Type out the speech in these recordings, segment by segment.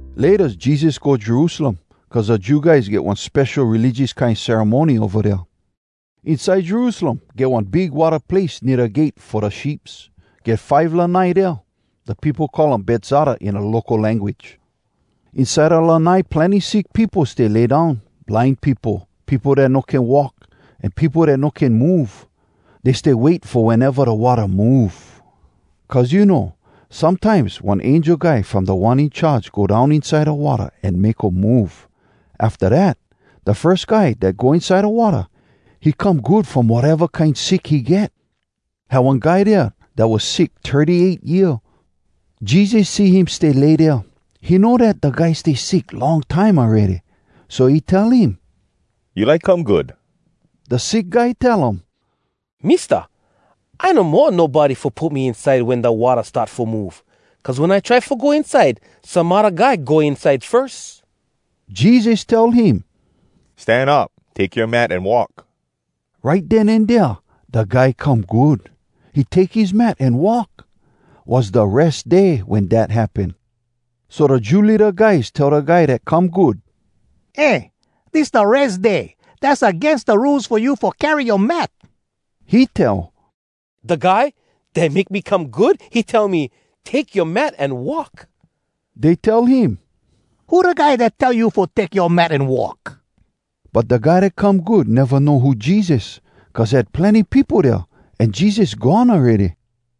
Laytas Jesus go Jerusalem, cuz da Jew guys get one spesho religious kine ceremony ova dea. Inside Jerusalem get one big watta place nea da Gate Fo Da Sheeps. Get five lanai dea. Da peopo call um “Betzata” in da local language. Inside da lanai plenny sick peopo stay lay down: blind peopo, peopo dat no can walk, an peopo dat no can move. [Dey stay wait fo weneva da watta move. Cuz you know, sometimes one angel guy from Da One In Charge go down inside da watta an make um move. Afta dat, da firs guy dat go inside da watta, he come good from wateva kine sick he get.] Had one guy dea dat was sick thirty-eight year. Jesus see him stay lay dea. He know dat da guy stay sick long time awready. So he tell him, “You like come good?” Da sick guy tell um, “Mista, I no mo nobody fo put me inside wen da watta start fo move. Cuz wen I try fo go inside, some odda guy go inside firs.” Jesus tell him, “Stan up! Take yoa mat an walk!” Right den an dea da guy come good. He take his mat an walk. Was da Res Day wen dat happen. So da Jew leada guys tell da guy dat come good, “Eh, dis da Res Day! Dass agains da Rules fo you fo carry yoa mat!” He tell, “Da guy dat make me come good, he tell me, ‘Take yoa mat an walk.’” Dey tell him, “Who da guy dat tell you fo take yoa mat an walk?” But da guy dat come good neva know who Jesus, cuz had plenny peopo dea, an Jesus gone awready.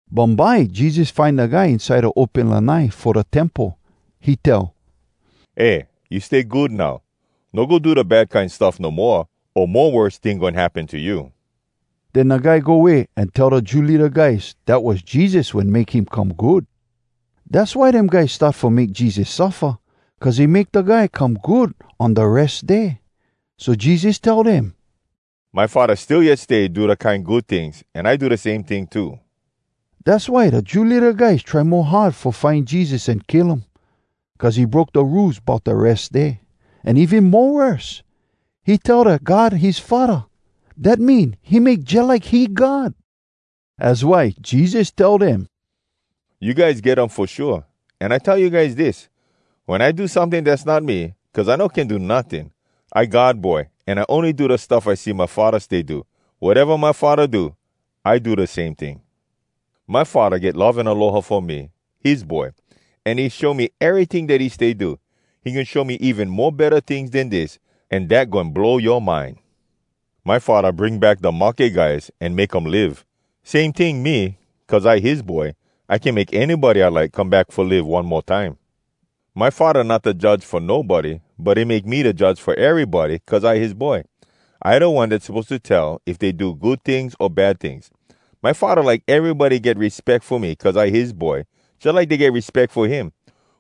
Bumbye Jesus find da guy inside da open lanai fo da Temple. He tell, “Eh, you stay good now. No go do da bad kine stuff no moa, o mo worse ting goin happen to you.” Den da guy go way an tell da Jew leada guys dat was Jesus wen make him come good. Dass why dem guys start fo make Jesus suffa, cuz he make da guy come good on da Res Day. So Jesus tell dem, “My Faddah still yet stay do da kine good tings, an I do da same ting too.” Dass why da Jew leada guys try mo hard fo find Jesus an kill um, cuz he broke da Rules bout da Res Day. An even mo worse, he tell dat God his Faddah. Dat mean he make jalike he God. Az why Jesus tell dem, “You guys get um fo shua! An I tell you guys dis: Wen I do someting, dass not me, cuz I no can do notting. I God Boy, an I ony do da stuff I see my Faddah stay do. Wateva my Faddah do, I do da same ting. My Faddah get love an aloha fo me, his Boy. An he show me eryting dat he stay do. He goin show me even mo betta tings den dis, an dat goin blow yoa mind! My Faddah bring back da mahke guys an make um live. Same ting, me, cuz I his Boy, I can make anybody I like come back fo live one mo time. My Faddah not da judge fo nobody, but he make me da judge fo erybody, cuz I his Boy. I da one dat suppose to tell if dey do good tings o bad tings. My Faddah like erybody get respeck fo me, cuz I his Boy, jalike dey get respeck fo him.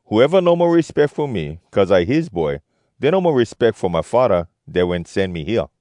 Whoeva no mo respeck fo me, cuz I his Boy, dey no mo respeck fo my Faddah dat wen sen me hea.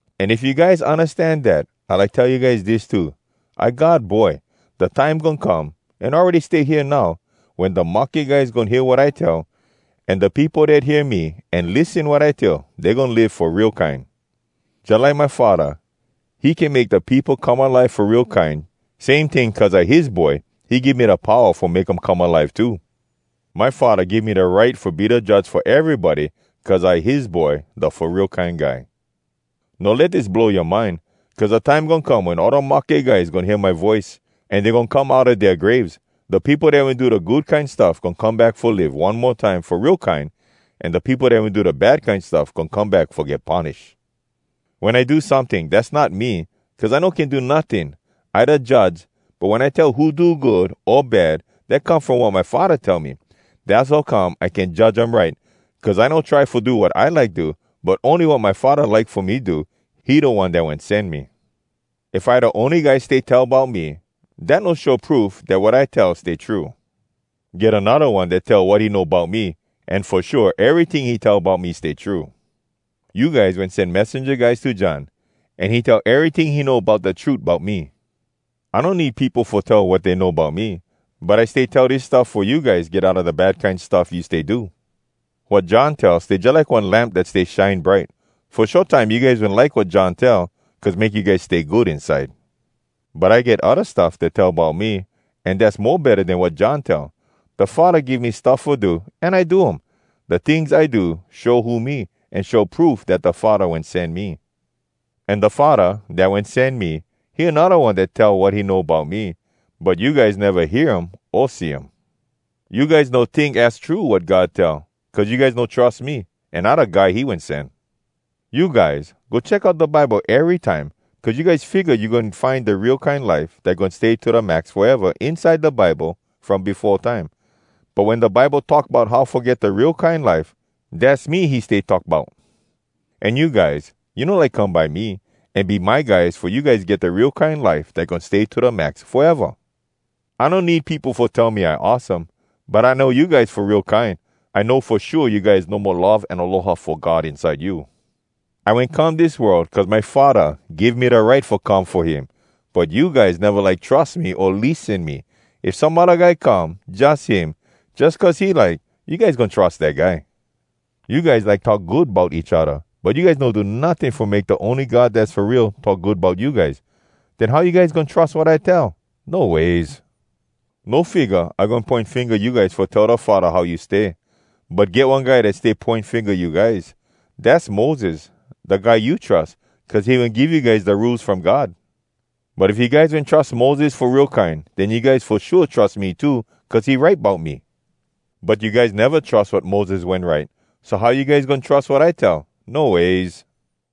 An if you guys undastan dat, I like tell you guys dis too: I God Boy. Da time goin come, an awready stay hea now, wen da mahke guys goin hear wat I tell. An da peopo dat hear me, an lissen wat I tell, dey goin live fo real kine. Jalike my Faddah, he can make da peopo come alive fo real kine, same ting, cuz I his Boy he give me da powa fo make um come alive too. My Faddah give me da right fo be da judge fo erybody, cuz I his Boy, da Fo Real Kine Guy. No let dis blow yoa mind, cuz da time goin come wen all da mahke guys goin hear my voice. An dey goin come outa dea graves. Da peopo dat wen do da good kine stuff goin come back fo live one mo time fo real kine, an da peopo dat wen do da bad kine stuff goin come back fo get punish. “Wen I do someting, dass not me, cuz I no can do notting. I da judge, but wen I tell who do good o bad, dat come from wat my Faddah tell me. Dass how come I can judge um right, cuz I no try fo do wat I like do, but ony wat my Faddah like fo me do. He da One dat wen sen me. “If I da ony guy stay tell bout me, dat no show proof dat wat I tell stay true. Get anodda One dat tell wat he know bout me. An fo shua eryting he tell bout me stay true. You guys wen sen messenja guys to John, an he tell eryting he know bout da trut bout me. I no need peopo fo tell wat dey know bout me. But I stay tell dis stuff fo you guys get outa da bad kine stuff you stay do. Wat John tell stay jalike one lamp dat stay shine bright. Fo short time you guys wen like wat John tell, cuz make you guys stay good inside. “But I get odda stuff dat tell bout me, an dass mo betta den wat John tell. Da Faddah give me stuff fo do, an I do um. Da tings I do show who me, an show proof dat da Faddah wen sen me. An da Faddah, dat wen sen me, he anodda One dat tell wat he know bout me. But you guys neva hear him o see him. You guys no tink az true wat God tell, cuz you guys no trus me, an I da guy he wen sen. You guys go check out da Bible erytime, cuz you guys figga you goin find da real kine life dat goin stay to da max foeva, inside da Bible from befo time. But wen da Bible talk bout how fo get da real kine life, dass me he stay talk bout. An you guys, you no like come by me an be my guys fo you guys get da real kine life dat goin stay to da max foeva! “I no need peopo fo tell me I awesome. But I know you guys fo real kine. I know fo shua you guys no mo love an aloha fo God inside you. I wen come dis world cuz my Faddah give me da right fo come fo him. But you guys neva like trus me o lissen me. If some odda guy come, jus him, jus cuz he like, you guys goin trus dat guy. You guys like talk good bout each odda, but you guys no do notting fo make da ony God dass fo real talk good bout you guys. Den how you guys goin trus wat I tell? No ways! “No figga I goin poin finga you guys fo tell da Faddah how you stay. But get one guy dat stay poin finga you guys. Dass Moses, da guy you trus, cuz he wen give you guys da Rules From God. But if you guys wen trus Moses fo real kine, den you guys fo shua trus me too, cuz he write bout me. But you guys neva trus wat Moses wen write, so how you guys goin trus wat I tell? No ways!”